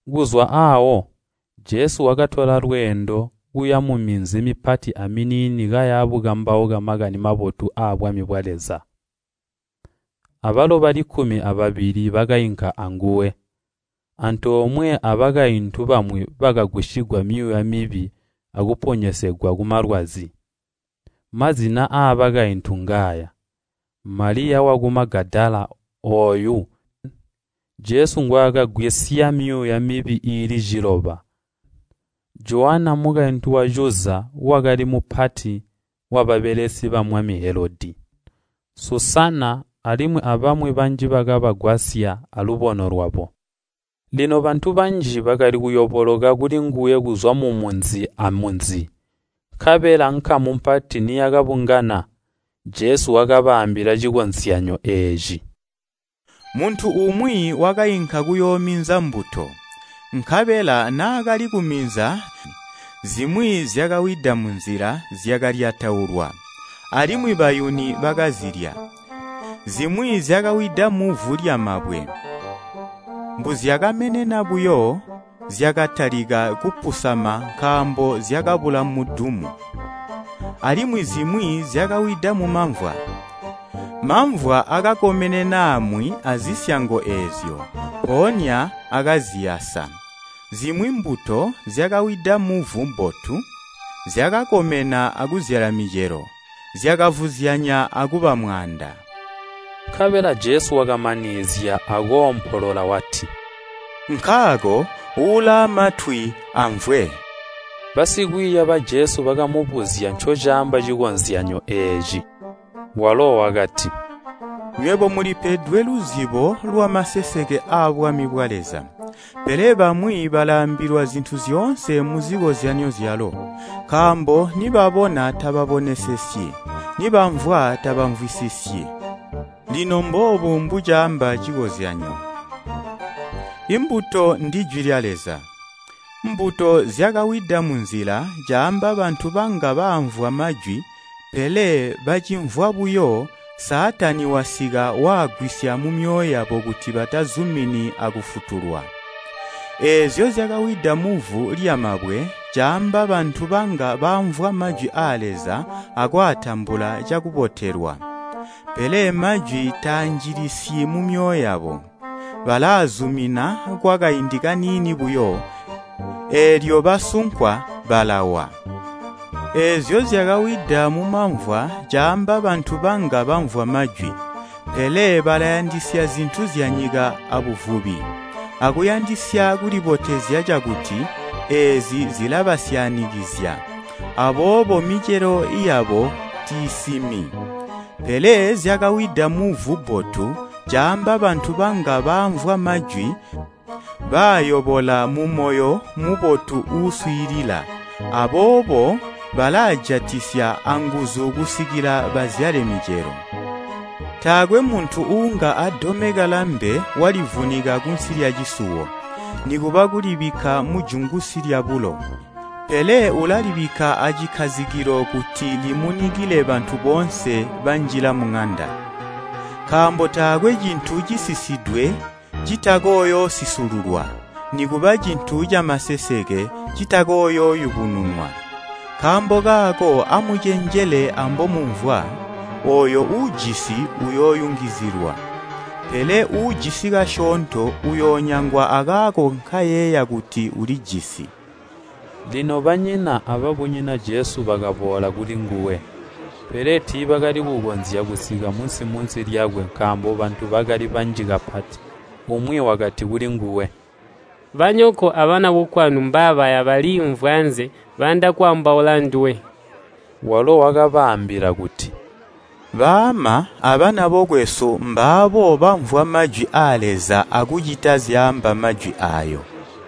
Kuzwa aawo, Jesu wakatola lweendo, kuya muminzi mipati aminiini kaya bukambauka makani mabotu abwami bwa Leza. Abalo bali kkumi ababili bakainka anguwe, antoomwe abakaintu bamwi bakagwisigwa myuuya mibi akuponyezegwa kumalwazi. Mazina aabakaintu ngaaya: Maliya waku Magadala ooyu Jesu ngwaakagwisya myuuya mibi iili ciloba, Jowana, mukaintu wa Cuza wakali mupati wababelesi bamwami Helodi, Susana, alimwi abamwi banji bakabagwasya alubono lwabo. Lino bantu banji bakali kuyoboloka kulinguwe kuzwa mumunzi amunzi, nkabela nkamu mpati niyakabungana, Jesu wakabaambila cikozyanyo eeci. “Muntu umwi wakainka kuyoominza mbuto. Nkabela naakali kuminza zimwi zyakawida munzila zyakalyataulwa, alimwi bayuni bakazilya, zimwi zyakawida muvu lyamabwe. Mbuzyakamenena buyo, zyakatalika kupusama nkaambo zyakabula mudumu. Alimwi zimwi zyakawida mumamvwa, mamvwa akakomenena aamwi azisyango eezyo, mpoonya akaziyasa. Zimwi mbuto zyakawida muvu bbotu, zyakakomena akuzyala micelo, zyakavuzyanya akuba mwaanda.” Nkabela Jesu wakamanizya akoompolola wati, “Nkaako ulaamwatwi amvwe!” Basikwiiya ba Jesu bakamubuzya ncocaamba cikozyanyo eeci. Walo wakati, “Nywebo mulipedwe luzibo lwamaseseke aabwami bwa Leza, pele bamwi balaambilwa zintu zyoonse muzikozyanyo zyalo, nkaambo nibabona tababonesesyi nibamvwa tabamvwisisisyi. “Lino mboobu mbucaamba cikozyanyo: Imbuto ndijwi lya Leza. Mbuto zyakawida munzila caamba bantu banga baamvwa majwi, pele bacimvwa buyo, Saatani wasika waagwisya mumyoyo yabo kuti batazumini akufutulwa. Eezyo zyakawida muvu lyamabwe caamba bantu banga baamvwa majwi aa Leza akwaatambula cakubotelwa. Pele majwi taanjilisyi mumyoyo yabo, balaazumina kwakaindi kaniini buyo, eelyo basunkwa balawa. Eezyo zyakawida mumamvwa caamba bantu banga bamvwa majwi, pele balayandisya zintu zyanyika abuvubi, akuyandisya kulibotezya cakuti, eezi zilabasyaanikizya, aboobo micelo yabo tiisimi. Pele zyakawida muvu bbotu caamba bantu banga baamvwa majwi, baayobola mumoyo mubotu uuswiilila, aboobo balaajatisya anguzu kusikila bazyale micelo. “Taakwe muntu uunga adomeka lambe walivunika kunsi lyacisuwo, nikuba kulibikka mujungusi lyabulo, pele ulalibikka acikkazikilo kuti limunikile bantu boonse banjila muŋanda. “Nkaambo taakwe cintu cisisidwe citakooyoosisululwa, nikuba cintu camaseseke citakooyooyubununwa. Nkaambo kaako amucenjele ambomumvwa, ooyo uujisi uyooyungizizilwa, pele uujisi kasyoonto uyoonyangwa akaako nkayeeya kuti ulijisi.” Lino banyina ababunyina Jesu bakaboola kulinguwe. Pele tiibakali kukonzya kusika munsi-munsi lyakwe nkaambo bantu bakali banji kapati. Umwi wakati kulinguwe, “Banyoko abana bokwanu mbabaya baliimvwi anze, bayanda kwaambaula anduwe.” Walo wakabaambila kuti, “Baama abana bokwesu mbaabo bamvwa majwi aa Leza akucita zyaamba majwi aayo.”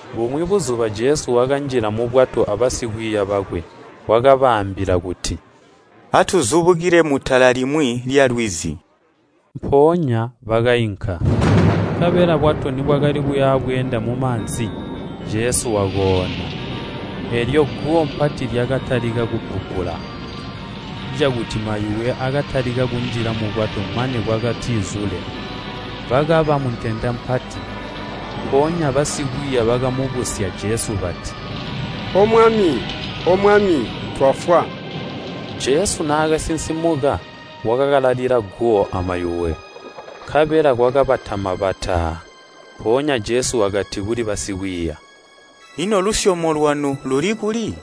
Bumwi buzuba Jesu wakanjila mubwato abasikwiiya bwakwe. Wakabaambila kuti, “Atuzubukile mutala limwi lyalwizi.” Mpoonya bakainka. Nkabela bwato nibwakali kuya bweenda mumaanzi, Jesu wakoona. Eelyo guwo pati lyakatalika kubbubbula, cakuti mayuwe akatalika kunjila mubwato mane bwakatizule, bakaba muntenda mpati. Mpoonya basikwiiya bakamubusya Jesu bati, “O Mwami, O Mwami! Twafwa!” Jesu naakasinsimuka wakakalalila guwo amayuwe. Nkabela kwakabatama bataa! Mpoonya Jesu wakati kuli basikwiiya, “Ino lusyomo lwanu luli kuli?”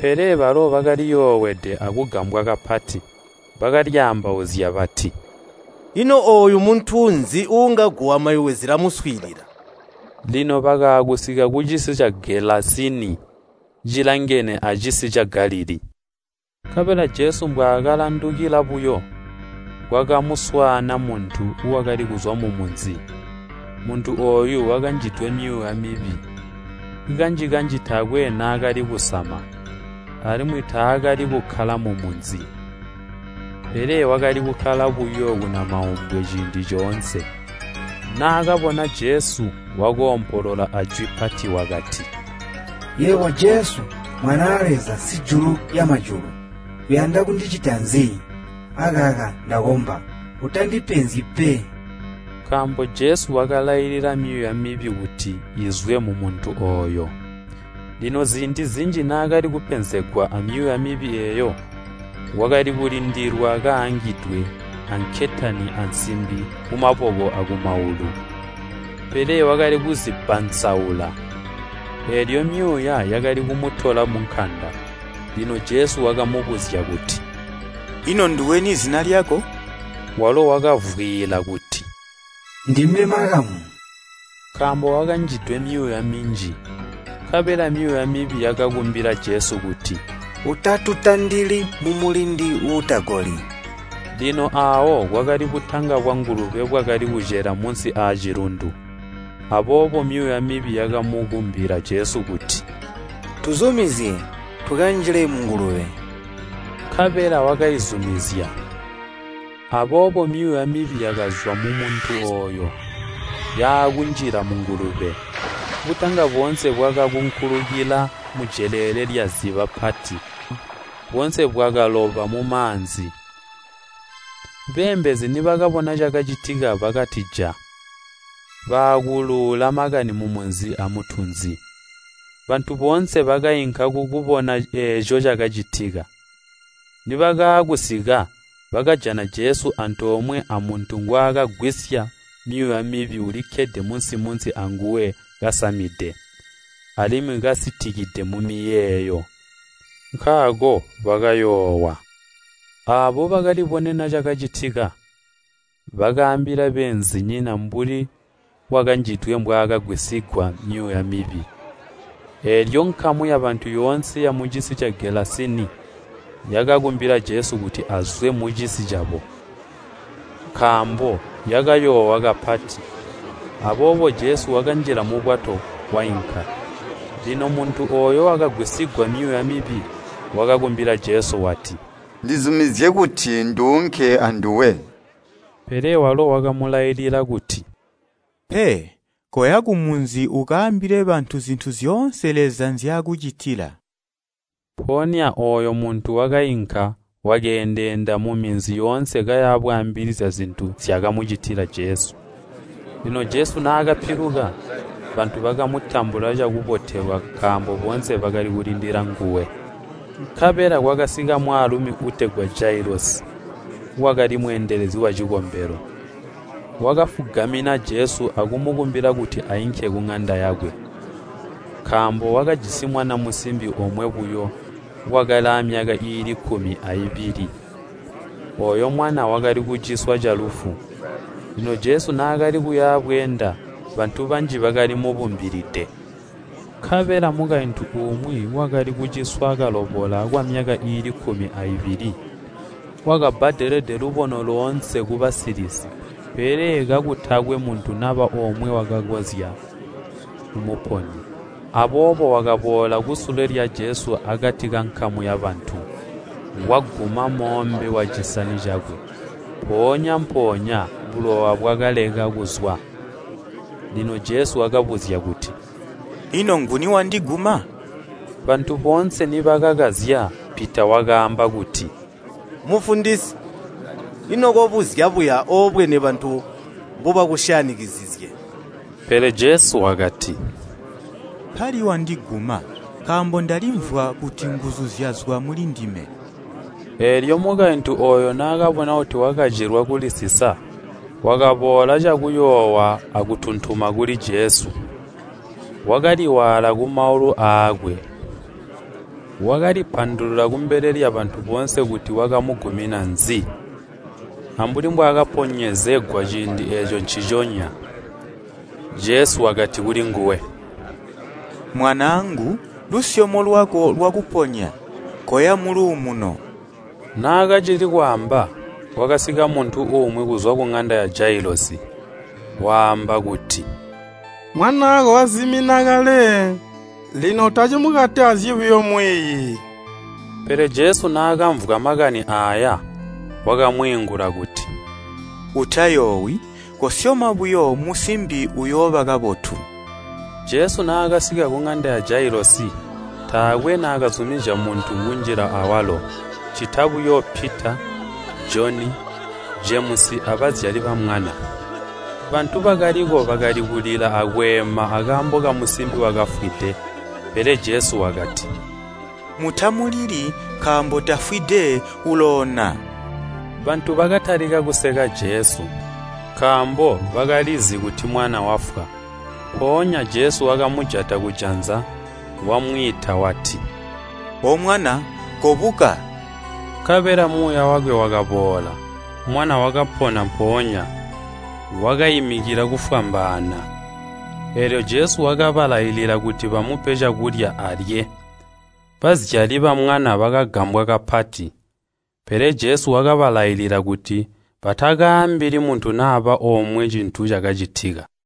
Pele balo bakaliyoowede akugambwa kapati. Bakalyaambauzya bati, “Ino ooyu muntu nzi uunga guwo amayuwe zilamuswiilila?” Lino bakaakusika kucisi ca Gelasini, cilangene acisi ca Galilii. Nkabela Jesu mbwaakalandukila buyo, kwakamuswaana muntu, wakali kuzwa mumunzi. Muntu ooyu wakanjidwe myuuya mibi. Kanji-kanji taakwe naakali kusama, alimwi taakali kukkala mumunzi, pele wakali kukkala buyo kunamaumbwe ciindi coonse. Naakabona Jesu wakoompolola ajwi pati wakati, “Yebo Jesu, Mwanaa Leza, Sijulu lyamajulu! Uyanda kundicita nzi? Akaka ndakomba, utandipenzyi pe!” Nkaambo Jesu wakalailila myuuya mibi kuti izwe mumuntu ooyo. Lino ziindi zinji naakali kupenzegwa amyuuya mibi eeyo, wakali kulindilwa kaangidwe ankentani ansimbi kumaboko akumaulu, pele wakali kuzibbansaula, eelyo myuuya yakali kumutola munkanda. Lino Jesu wakamubuzya kuti, “Ino nduweni zina lyako?” Walo wakavwiila kuti, “Ndime ‘Makamu,’” nkaambo wakanjidwe myuuya minji. Nkabela myuuya mibi yakakumbila Jesu kuti, “Utatutandili mumulindi uutagoli.” Lino aawo kwakali butanga bwangulube bwakali kucela munsi aacilundu, aboobo myuuya mibi yakamukumbila Jesu kuti, “Tuzumizye tukanjile mungulube.” Nkabela wakaizumizya. Aboobo myuuya mibi yakazwa mumuntu ooyo, yaakunjila mungulube. Butanga boonse bwakakunkulikila mujeleele lyaziba pati, boonse bwakaloba mumaanzi. Beembezi nibakabona cakacitika bakatija, baakuluula makani mumunzi amutunzi. Bantu boonse bakainka kukubona eeco cakacitika. Nibakaakusika, bakajana Jesu antoomwe amuntu ngwaakagwisya myuuya mibi ulikkede munsi-munsi anguwe kasamide, alimwi kasitikide mumiyeeyo, nkaako bakayoowa. Aabo bakalibonena kacicitika, bakaambila beenzinyina mbuli wakanjidwe mbwaakagwisigwa myuuya mibi. Eelyo nkamu yabantu yoonse yamucisi ca Gelasini yakakumbila Jesu kuti azwe mucisi cabo, nkaambo yakayoowa kapati. Aboobo Jesu wakanjila mubwato wainka. Lino muntu ooyo wakagwisigwa myuuya mibi, wakakumbila Jesu wati, “Ndizumizye kuti nduunke anduwe.” Pele walo wakamulailila kuti, “Pe, koya kumunzi ukaambile bantu zintu zyoonse Leza nzyaakucitila.” Mpoonya ooyo muntu wakainka wakeendeenda muminzi yoonse kaya bwaambilizya zintu nzyaakamucitila Jesu. Lino Jesu naakapiluka, bantu bakamutambula cakubotelwa nkaambo boonse bakali kulindila nguwe. Nkabela kwakasika mwaalumi uutegwa Jailosi wakali mweendelezi wacikombelo. Wakafugamina Jesu akumukumbila kuti ainke kuŋanda yakwe, nkaambo wakajisi mwana musimbi omwe buyo, wakali amyaka iili kkumi aibili. Ooyo mwana wakali kuciswa calufu. Lino Jesu naakali kuyabweenda, bantu banji bakali mubumbilide. Nkabela mukaintu umwi, wakali kuciswa kalobola kwamyaka iili kkumi aibili, wakabbadelede lubono loonse kubasilisi, pele kakutakwe muntu naba omwe wakakonzya kumuponya. Aboobo wakaboola kusule lya Jesu akati kankamu yabantu, waguma moombe wacisani cakwe. Mpoonya-mpoonya bulowa bwakaleka kuzwa. Lino Jesu wakabuzya kuti, “Ino nguni wandiguma?” Bantu boonse nibakakazya, Pita wakaamba kuti, “Mufundisi, ino kobuzya buya oobwene bantu mbobakusyanikizizye!” Pele Jesu wakati, “Mpali wandiguma, nkaambo ndalimvwa kuti nguzu zyazwa mulindime.” Eelyo mukaintu ooyo naakabona kuti wakacilwa kulisisa, wakaboola cakuyoowa akutuntuma kuli Jesu, wakaliwaala kumaulu aakwe. Wakalipandulula kumbele lyabantu boonse kuti wakamugumina nzi, ambuli mbwaakaponyezegwa ciindi eeco nciconya. Jesu wakati kulinguwe, “Mwanaangu, lusyomo lwako lwakuponya. Koya muluumuno.” Naakacili kwaamba, kwakasika muntu umwi kuzwa kuŋanda ya Jailosi, waamba kuti, “Mwanaako wazimina kale, ino utacimukatazyi buyo Mwiiyi.” Pele Jesu naakamvwa makani aaya, wakamwiingula kuti, “Utayoowi, kosyoma buyo musimbi uyooba kabotu.” Jesu naakasika kuŋanda ya Jailosi, taakwe naakazumizya muntu kunjila awalo, ccita buyo Pita, Joni, Jemusi abazyali bamwana. Bantu bakaliko bakali kulila akweema akaambo kamusimbi wakafwide. Pele Jesu wakati, “Mutamulili, nkaambo tafwide, uloona!” Bantu bakatalika kuseka Jesu, nkaambo bakalizi kuti mwana wafwa. Mpoonya Jesu wakamujata kujanza, wamwiita wati, “O Mwana, kobuka!” Nkabela muuya wakwe wakaboola, mwana wakapona mpoonya, wakaimikila kufwambaana. Eelyo Jesu wakabalailila kuti bamupe cakulya alye. Bazyali bamwana bakagambwa kapati, pele Jesu wakabalailila kuti batakaambili muntu naba omwe cintu cacitika.